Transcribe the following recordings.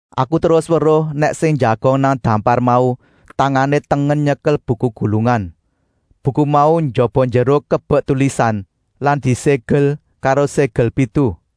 Aku terus weruh nèk sing njagong nang dampar mau tangané tengen nyekel buku gulungan. Buku mau njaba-njero kebek tulisan lan diségel karo ségel pitu.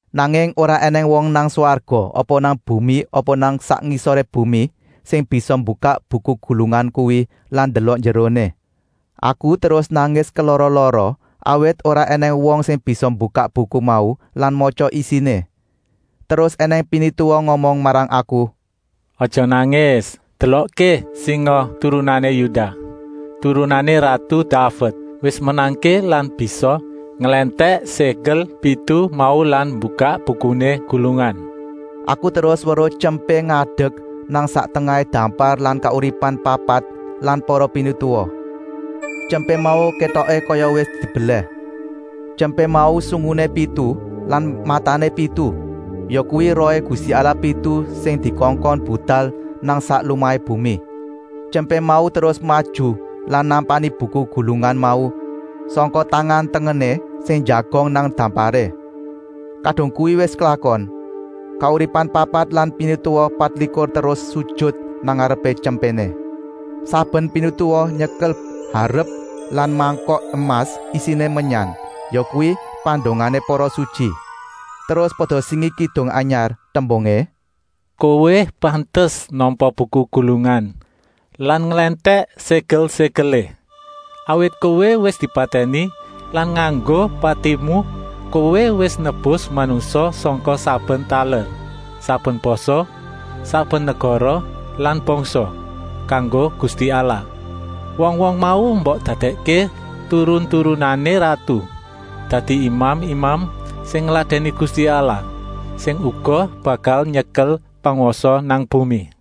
Nanging ora ènèng wong nang swarga apa nang bumi apa nang sak ngisoré bumi sing bisa mbukak buku gulungan kuwi lan ndelok njeroné. Aku terus nangis kelara-lara, awit ora ènèng wong sing bisa mbukak buku mau lan matya isiné. Terus ènèng pinituwa ngomong marang aku: “Aja nangis! Delokké, singa turunané Yudah, turunané ratu Daved, wis menangké lan bisa nglèntèk ségel pitu mau lan mbukak bukuné gulungan.” Aku terus weruh Tyempé ngadek nang sak tengahé dampar lan kauripan papat lan para pinituwa. Tyempé mau kétoké kaya wis dibelèh. Tyempé mau sunguné pitu lan matané pitu, yakuwi rohé Gusti Allah pitu sing dikongkon budal nang sak lumahé bumi. Tyempé mau terus maju lan nampani buku gulungan mau sangka tangan-tengené sing njagong nang damparé. Kadung kuwi wis klakon, kauripan papat lan pinituwa patlikur terus sujut nang ngarepé Tyempéné. Saben pinituwa nyekel harep lan mangkok emas isiné menyan, yakuwi pandongané para sutyi. Terus pada singi kidung anyar, tembungé: “Kowé pantes nampa buku gulungan lan nglèntèk ségel-ségelé. Awit Kowé wis dipatèni lan nganggo patimu Kowé wis nebus manungsa sangka saben taler, saben basa, saben negara lan bangsa, kanggo Gusti Allah. Wong-wong mau mbok dadèkké turun-turunané ratu, dadi imam-imam sing ngladèni Gusti Allah, sing uga bakal nyekel pangwasa nang bumi.”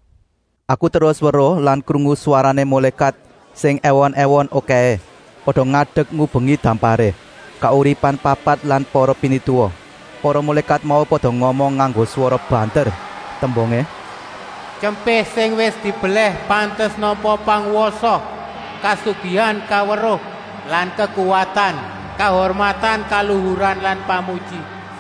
Aku terus weruh lan krungu swarané mulékat sing èwon-èwon okèhé. Pada ngadek ngubengi damparé, kauripan papat lan para pinituwa. Para mulékat mau pada ngomong nganggo swara banter, tembungé: “Tyempé sing wis dibelèh pantes nampa pangwasa, kasugihan, kaweruh lan kekuwatan, kahurmatan, kaluhuran lan pamuji.”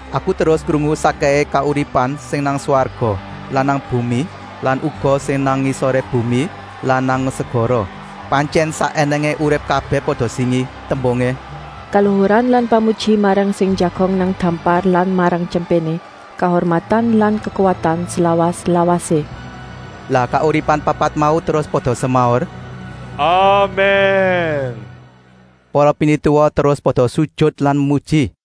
Aku terus krungu sakkèhé kauripan sing nang swarga lan nang bumi lan uga sing nang sak ngisoré bumi lan nang segara, pantyèn sak ènèngé urip kabèh pada singi, tembungé: “Kaluhuran lan pamuji marang sing njagong nang dampar lan marang Tyempéné, kahurmatan lan kekuwatan slawas-lawasé.” Lah kauripan papat mau terus pada semaur: “Amèn.” Para pinituwa terus pada sujut lan memuji.